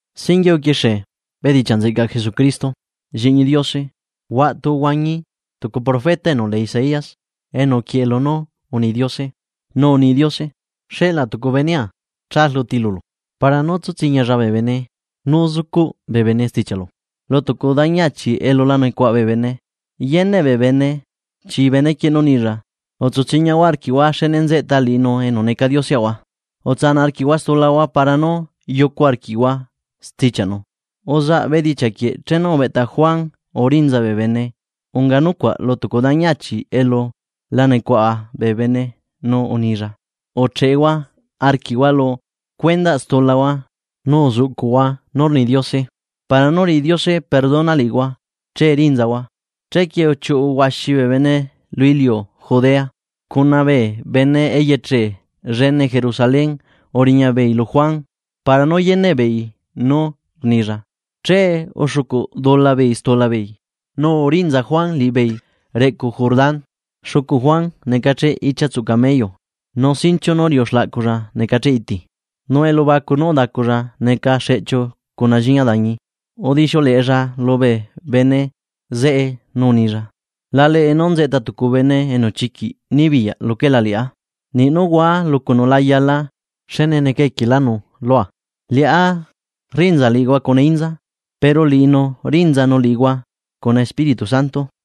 Singuie uquixie bedichiaꞌ nzeꞌcaꞌ Jesucristo, Lliꞌñi Diose. Huaꞌtu uhuañi tucu profeta enu lee Isaías enu uquieꞌe lunú uni Diose, nu uni Diose: Xeꞌlaa tucu benea cha rluti lulu, para nú tsu tsiñialla bee bene nú zucuꞌ bee bene stichiaꞌlu. Lu tucu dañi achi elu la nucuaꞌa bee bene yeneꞌ bee bene chi benequieꞌ nú nilla: “Utsu tsiñahua arquiꞌhua xne nzeꞌta liꞌinu enu neca Dioseꞌahua. Utsanaꞌ arquiꞌhua stulahua para nú yucu arquiꞌhua stichiaꞌnu.” Uzaꞌ bee bedichiaꞌ quieꞌ chenu ubeꞌta Juan urinzalla bee bene unga nucuaꞌ lu tucu dañi achi elu la nucuaꞌa bee bene, nu unilla: ―Ucheꞌehua arquiꞌhua lu stulahua nu uzuꞌcuꞌhua nú rni Diose, para nú riꞌi Diose perdona liꞌihua che rinzahua. Chequie uchiuꞌu huaxi bee bene lubee iliu Judea cuna bee bene eyeche llene Jerusalén uriñabeei lu Juan para nú yeneꞌbeei nú rnilla. Che uxucuꞌdulabeei stulabeei nu urinza Juan liꞌibeei reꞌcu Jordán. Xucu Juan necacheꞌ ichiatsuꞌ camello nu sinchiu nú riuꞌu xlaꞌculla necacheꞌ iti, nu elubacu nú udaculla neca xeꞌchiu cuna lliña dañi. Udixiuleꞌella lubee bene zeꞌe nú unilla: ―La leꞌe nú nzeꞌta tucu bene enu chiquiꞌ nibiyaꞌ luquela liꞌá, niꞌ nú hua lucunu la yala xne neca equielánu lua. Liꞌá rrinza liꞌihua cuna inza, pero liꞌinu rinzanu liꞌihua cuna Espíritu Santo.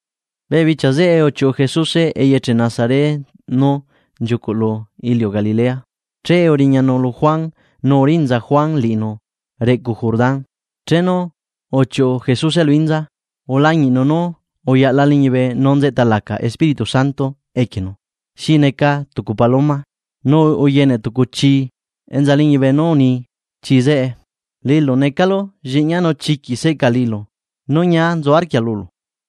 Bee bichia zeꞌe uchiuꞌu Jesuse eyeche Nazaret nú nchiucuꞌ lu iliu Galilea. Che uriñanu lu Juan nu urinza Juan liꞌinu reꞌcu Jordán. Chenu uchiuꞌu Jesuse lu inza, ulañiꞌnu nú uyaꞌla liñibe nu nzeꞌta laca Espíritu Santo equienu. Xi neca tucu paloma. Nu uyene tucu chii enza liñibe nu uni chii zeꞌe: ―Liꞌilu necalu lliꞌñia nu chiquiꞌ seꞌca liꞌilu nu ñia nzu arquia lulu.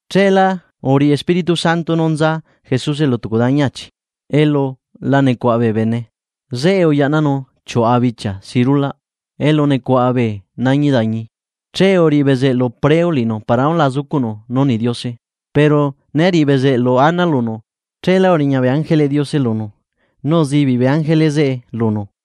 Cheelá uriꞌi Espíritu Santo nú nza Jesuse lu tucu dañi achi elu la nucuaꞌa bee bene. Zeꞌe uyaꞌnanu chiuꞌa bichia si rulaꞌ elu nucuaꞌa bee nañi dañi, che uriꞌi bezeꞌlu preu liꞌinu para nú la zucuꞌnu nú rni Diose. Pero né riꞌi bezeꞌlu ana lunu cheelá uriña bee ángeleꞌ Diose lunu nu uzibiꞌ bee ángele zeꞌe lunu.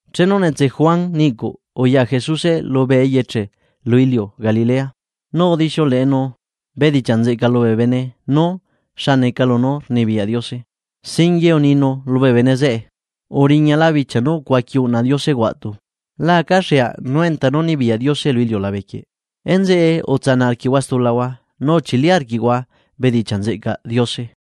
Chenu netse Juan niꞌcuꞌ uya Jesuse lubee eyeche lu iliu Galilea, nu udixiuleꞌenu bedichiaꞌ nzeꞌca lubee bene nú xa neca lunú rnibiyaꞌ Diose. Singuie uninu lubee bene zeꞌe: ―Uriñala bichia nú ucuaqui uꞌna Diose huaꞌtu. La acaxeaꞌ nú enta nú nibiyaꞌ Diose lu iliulabe quieꞌ. Enzeꞌe utsanaꞌ arquiꞌhua stulahua nu uchili arquiꞌhua bedichiaꞌ nzeꞌcaꞌ Diose.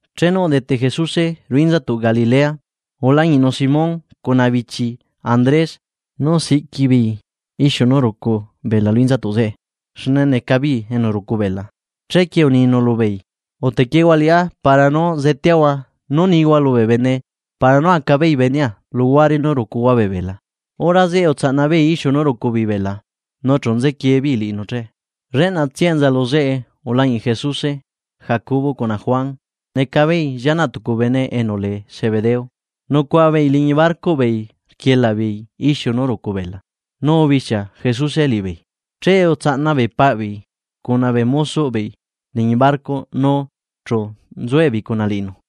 Chenu udete Jesuse ruꞌu inzatuꞌ Galilea ulañiꞌnu Simón cuna bichii Andrés nú siꞌqui beei ixiu nú rucu bela lu inzatuꞌ zeꞌe xne neca beei enu rucu bela. Chequie uninu lubeei: ―Utequiehua liꞌá para nú zeteahua nú nihua lubee bene para nú aca beei benea luhuare nú rucuhua bee bela. Hora zeꞌe utsaꞌna beei ixiu nú rucu bela nu chu nzequie beei liꞌinu che. Lleꞌnatsia enza lu zeꞌe ulañiꞌ Jesuse Jacobo cuna Juan neca beei llianaꞌ tucu bene enu lee Zebedeo. Nucuaꞌa beei liñi barcoꞌ beei rquielaꞌ beei ixiu nú rucu bela. Nu ubixia Jesuse liꞌibeei, che utsaꞌna beei paꞌ beei cuna bee mozoꞌ beei liñi barco nu chu nzuebeei cuna liꞌinu.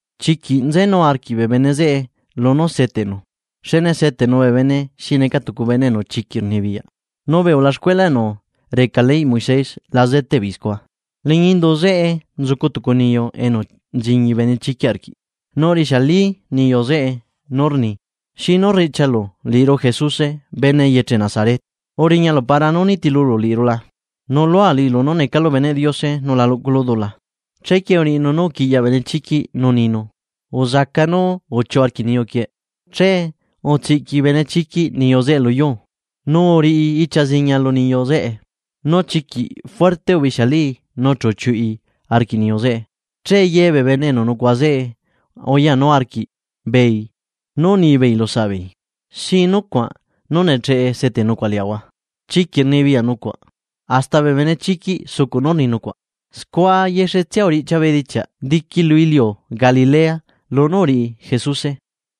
Chiquiꞌ nzenu arquiꞌ bee bene zeꞌe lunú seteꞌnu xne seteꞌnu bee bene xi neca tucu bene enu chiquiꞌ rnibiyaꞌ nu bee ulaxcuela enu reca leyꞌ Moisés la zeteꞌ beei scua. Liñi indu zeꞌe nzucu tucu niyu enu nchiñi benechiquiꞌ arquiꞌ, nu rixiali niyu zeꞌe nú rni: ―¿Xinu rriꞌchialu liꞌiru Jesuse bene eyeche Nazaret? ¿Uriñalu para nú nitilulu liꞌiru la? Nuꞌlua liꞌilu nú necalu beneꞌ Diose nu la luꞌculu dula. Chequie uriꞌinu nú uquiꞌyaꞌ benechiquiꞌ nu uninu: ―¡Uzaca nu uchiuꞌu arquiꞌ niyu quieꞌ! Che utsiꞌqui benechiquiꞌ niyu zeꞌe lu yuu, nu uriꞌi ichia ziñia lu niyu zeꞌe. Nu chiquiꞌ juerte rixialii nu chu uchiuꞌi arquiꞌ niyu zeꞌe. Che ye bee bene enu nucuaꞌa zeꞌe uyanu arquiꞌbeei nú unibeei lu saꞌbeei: ―¿Xi nucuaꞌ? Nú, ¡necheꞌe seteꞌ nucuaꞌ liaꞌahua chiquiꞌ rnibiyaꞌ nucuaꞌ hasta bee benechiquiꞌ sucuꞌ nú rni nucuaꞌ! Scua yexetsia uriꞌchia bedichiaꞌ diqui lu iliu Galilea lunú uriꞌi Jesuse.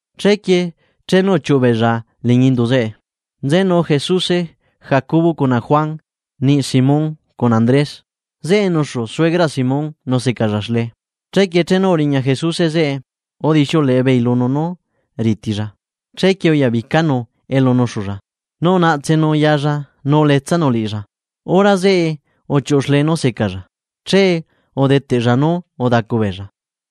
Chequie chenu uchiuꞌu beella liñi indu zeꞌe. Nzenu Jesuse, Jacobo cuna Juan niꞌ Simón cuna Andrés. Zeꞌe nuxu suegraꞌ Simón nu secalla xlee. Chequie chenu uriña Jesuse zeꞌe, udixiuleꞌe beei lunu nú ritilla. Chequie uyabicanu elu nuxulla nu unaꞌtsenu yalla nu uletsanu liꞌilla. Hora zeꞌe uchiuꞌu xlee nú secalla. Che udeteꞌlla nú udacu beella.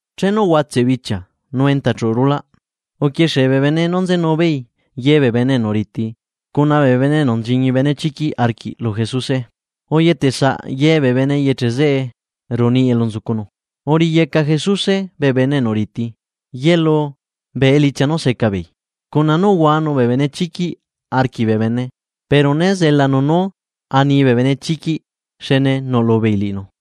Chenu uhuatseꞌ bichia nu enta chuꞌu rulaꞌ. Uquixie bee bene nú uriñayu beei ye bee bene enu riti cuna bee bene enu nchiñi benechiquiꞌ arquiꞌ lu Jesuse. Uyetesaꞌ ye bee bene eyeche zeꞌe ruꞌu niꞌi elu nzucunu. Uriꞌiyeca Jesuse bee bene enu riti ye luu bee elichia nú seca beei, cuna nú uhuanu bee benechiquiꞌ arquiꞌ bee bene. Pero né zelanu nú ani bee benechiquiꞌ, xne nuꞌlu beei liꞌinu.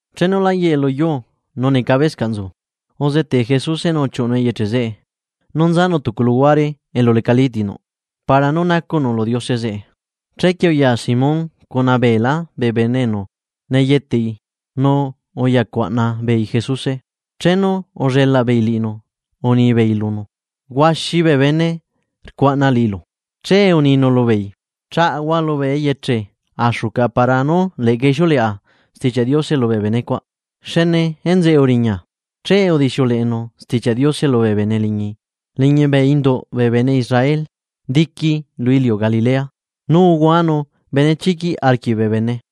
Chenu lá yeꞌe lu yuu nu necabescaꞌ nzu uzetee Jesuse nu uchiuꞌunu eyeche zeꞌe nu nzanu tucu luhuare elu lecalí ti nuꞌ para nú nacuꞌnu lu Diose zeꞌe. Chequie uya Simón cuna beelá bee bene enu neyeteꞌi nu uyacuaꞌna beei Jesuse. Chenu ullelaꞌ beei liꞌinu, unibeei lunu: ―Huaxi bee bene rcuaꞌna liꞌilu. Che uninu lubeei: ―Chaꞌahua lubee eyeche axu caꞌa para nú leꞌca ixiuleꞌa Stichiaꞌ Diose lubee bene cuaꞌ xne enzeꞌe uriña. Che udixiuleꞌenu Stichiaꞌ Diose lubee bene liñi bee induꞌ bee bene Israel diqui lu iliu Galilea. Nu uhuanu benechiquiꞌ arquiꞌ bee bene.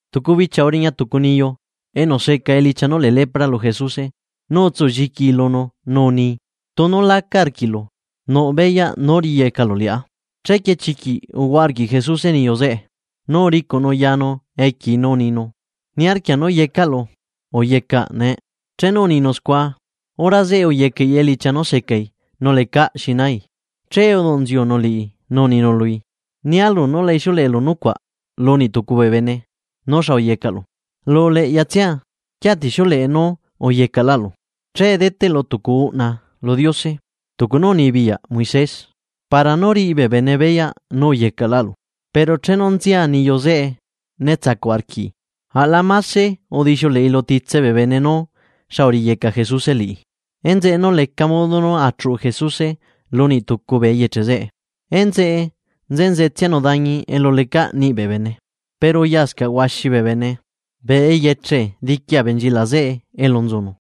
Tucu bichia uriña tucu niyu enu seca elichia nú lee lepra lu Jesuse nu utsu lliquii lunu nu uni: ―Tunu laca arquiꞌlu nuꞌ beyaꞌ nú riꞌiyecalu liꞌá. Chequie chiquiꞌ uhuaꞌa arquiꞌ Jesuse niyu zeꞌe nu uricuꞌnu yanu equiei nu uninu: ―Niarquia nú yecaꞌlu, uyecaꞌ nee. Chenu uninu scua, hora zeꞌe uyecaꞌi elichia nú secai nu lecaꞌ xi nai. Che uduꞌ nziunu liꞌi nu uninu lui: ―Nia lulu nú la ixiuleꞌelu nucuaꞌ lu niꞌ tucu bee bene nú xa uyecaꞌlu. Lu uleꞌyatsia uquiatixiuleꞌe nú uyecaꞌlaꞌlu. Che deteꞌlu tucu uꞌna lu Diose tucu nú unibiyaꞌ Moisés, para nú riꞌi bee bene beyaꞌ nú uyecaꞌlaꞌlu. Pero chenu nzia niyu zeꞌe, né tsacuꞌ arquiꞌi. Aꞌla mase udixiuleꞌi lu titse bee bene nú xa uriꞌiyeca Jesuse liꞌi. Enzeꞌe leca modo nú achuꞌu Jesuse lu niꞌ tucu bee eyeche zeꞌe. Enzeꞌe enzetsianu dañi elu lecaꞌ niꞌi bee bene. Pero uyascaꞌ huaxi bee bene bee eyeche diqui abenchilaꞌ zeꞌe elu nzucunu.